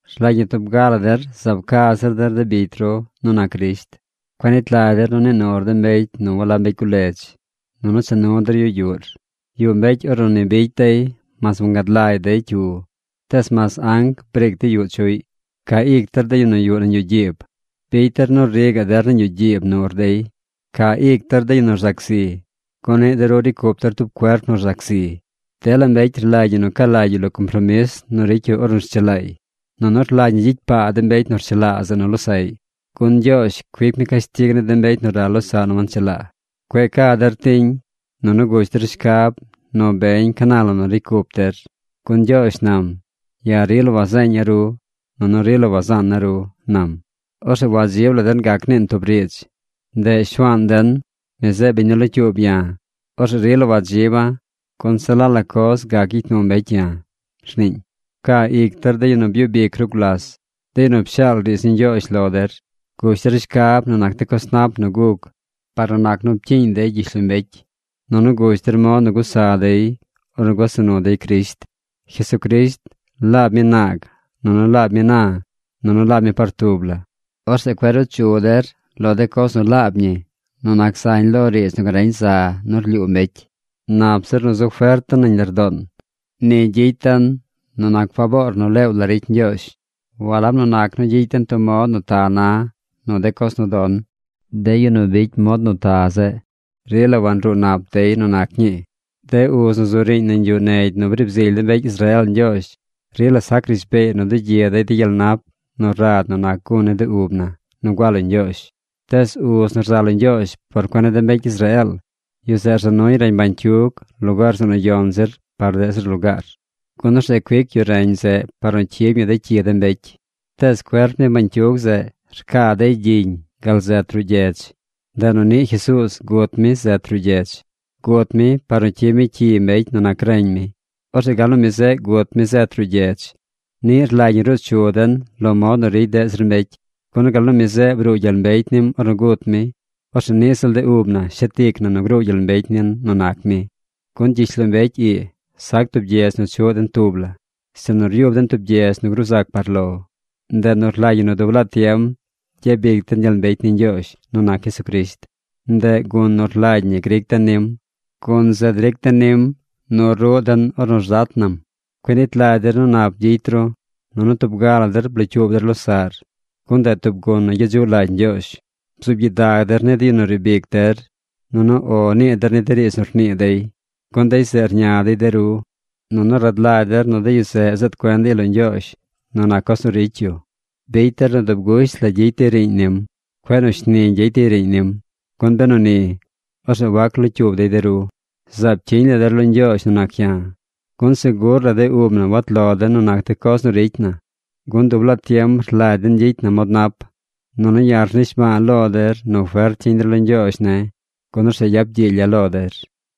Rlagy ñi tub ga la der zaab ca zir der de bicy ru nu nac Crisht. Cueꞌ nit lagy der nu nii nur de mbecy nu walab mbecy guledz nunu cha nu der yu yuꞌr. Yuꞌ mbecy ornu ni bicy dey mas wangad lagy dey cyu, tees mas anc briic dey yuꞌ chuꞌy. Ca ic der de yu nu yuꞌ nañ yuꞌ gyiib. Bicy der nu ri gaꞌ der nañ yuꞌ gyiib nur dey. Ca ic der de yu nu rzac zi, gun niꞌ de ru ricy cup der tub cuerp nu rzac zi. Dela mbecy rlagy ñi nu ca lagy yu lo compromis nu ricy yu ornu rchelaay. Nunu rlagy ñi gyicy paa de mbecy nu rchelaa zeꞌ nu losaꞌy, gun Ñgyoozh cuic mi cashtig ni de mbecy nu ral losaꞌ nu wanchelaa. Cueꞌ ca der tiñ. Nunu gush der shcab nu beñ ca na la nu ricy cup der. Gun Ñgyoozh nam: “Ya̱ rila wazeeña̱ ru, nunu rila wazaana̱ ru”, nam. Orzeꞌ wadzib la den gac niin tub riidz. Ndeꞌ Shuaan den, mi zeꞌ biñ nu locyuub ya̱. Orzeꞌ rila wadziba̱, gun se la la coz gac gyicy nu mbecy ya̱ rniiñ. Pcaa ic der de yu nu byub ic ru gulas, de yu nu pshaal riidz ni Ñgyoozh lo der. Gush der shcab nu nac de coz nap nu guc par nu nac nu pcyiiñ dey gyishlombecy, nunu gush der mod nu gusa dey ornu gusa nu dey Crisht. Jesucrisht laab mi naag, nunu laab mi na, nunu laab mi par tub la. Orzeꞌ cueꞌ ruu chu der lo de coz nu laab ñi nu nac zañ lo riidz nu gareñ za nu rlyuu mbecy. Nap zir nu zu fert den nañ lardoon. Ni gyicy den nu nac faboor nu leew la ricy Ñgyoozh, walab nu nac nu gyicy den tub mod nu ta na nu de coz nu don. De yu nu ricy mod nu ta zeꞌ rila wanruu nap dey nu nac ñii. De uz nu zu riiñ nañ yuꞌ negy nu briib zily de mbecy Israeel Ñgyoozh rila sac rishbeey nu dugyi dey de gyel nap nu rad nu nac gun ni de ub na nu gua lo Ñgyoozh. Tees uz nu rza lo Ñgyoozh por cuen ni de mbecy Israeel, yu zeꞌ rza nuy reñ bañcyug lugaar zeꞌ nu yon zir par deꞌ zir lugaar. Gun orzeꞌ cuic yu reñ zeꞌ par nu cyib ñi de cyi de mbecy. Tees cuerp ni bañcyug zeꞌ rcaa dey gyiñ gal zet ruꞌ gyedz. Ndeꞌ nu niꞌ Jesuuz gut mi zet ruꞌ gyedz. Gut mi par nu cyib mi cyi mbecy nu nac reñ mi. Orzeꞌ gal nu mi zeꞌ gut mi zet ruꞌ gyedz, niꞌ rlagy ñi ruu chu den lo mod nu ricy deꞌ zir mbecy. Gun gal nu mi zeꞌ bruu gyel mbecy nim ornu gut mi, orzeꞌ niꞌ ziꞌl de ub na shet ic na nu gruu gyel mbecy nin nu nac mi. Gun gyishlombecy ii sac tub gyedz nu chuꞌ den tub la, sinu ryub den tub gyedz nu gruu zac par lo. Ndeꞌ nu rlagy ñi nu dub laa tiem gyabic den gyel mbecy ni Ñgyoozh nu nac Jesucrisht. Ndeꞌ gun nu rlagy ñi gric den nim. Gun zeꞌ dric den nim nu ruꞌ den ornu rzat nam. Cueꞌ nit lagy der nu nap gyicy ru. Nunu tub ga la der blocyuub der losaꞌr, gun ndeꞌ tub gun nu gyedzuꞌ lagy Ñgyoozh. Bzuub gyidag der ni de yu nu riib ic der, nunu “O” nii der ni de riidz nu rnii dey, gun dey zeꞌ rña dey de ru. Nunu rad lagy der nu de yu zeꞌ zeed cuen dey lo Ñgyoozh nu nac coz nu ricy yu. Bicy der nu dub gusht la gyicy dey riiñ nim. Cueꞌ nu shni gyicy dey riiñ nim, gun benu ni, orzeꞌ wac locyuub dey de ru. Zaab cyiñ la der lo Ñgyoozh nu nac ya̱. Gun segur la de ub na wat lo den nu nac de coz nu ricy na, gun dub laa tiem rlagy den gyicy na mod nap. Nunu ya̱ rnishba̱a̱ lo der nu fert cyiñ der lo Ñgyoozh ne̱, gun orzeꞌ yap gyiilya̱ lo der.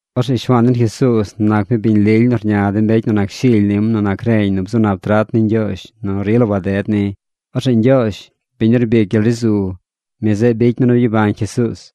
Orzeꞌ Shuaan den Jesuuz nac mi biñ lily nu rña de mbecy nu nac shily nim nu nac reñ mi nu bzu nap trat ni Ñgyoozh nu rila waded ni. Orzeꞌ Ñgyoozh, biñ nu rbic gyel ri zu, mi zeꞌ bicy mi nu byabañ Jesuuz.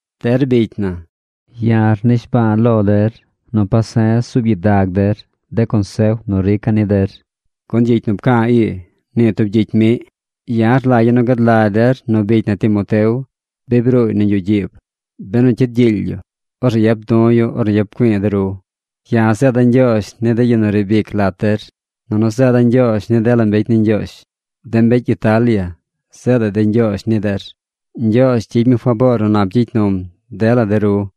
Der bicy na, ya̱ rnishba̱a̱ lo der nu pase̱z zuub gyidag der de consef nu rica̱ ni der, gun gyicy nu pca̱a̱ ii, nii tub gyicy miꞌ. Ya̱ rlagya̱ nu gad lagy der nu bicy na Timoteo, bi bruuy nañ yuꞌ gyiib. Benu cyid gyiily yu, orzeꞌ yap du̱ yu ornu yap güi̱i̱ de ru. Ya̱ zeeda̱ ñgyoozh ni de yu nu riib ic lat der, nunu zeeda̱ ñgyoozh ni dela mbecy ni Ñgyoozh. De mbecy Italia zeedaꞌ dey ñgyoozh ni der. Ñgyoozh gyicy mi faboor nu nap gyicy num dela der.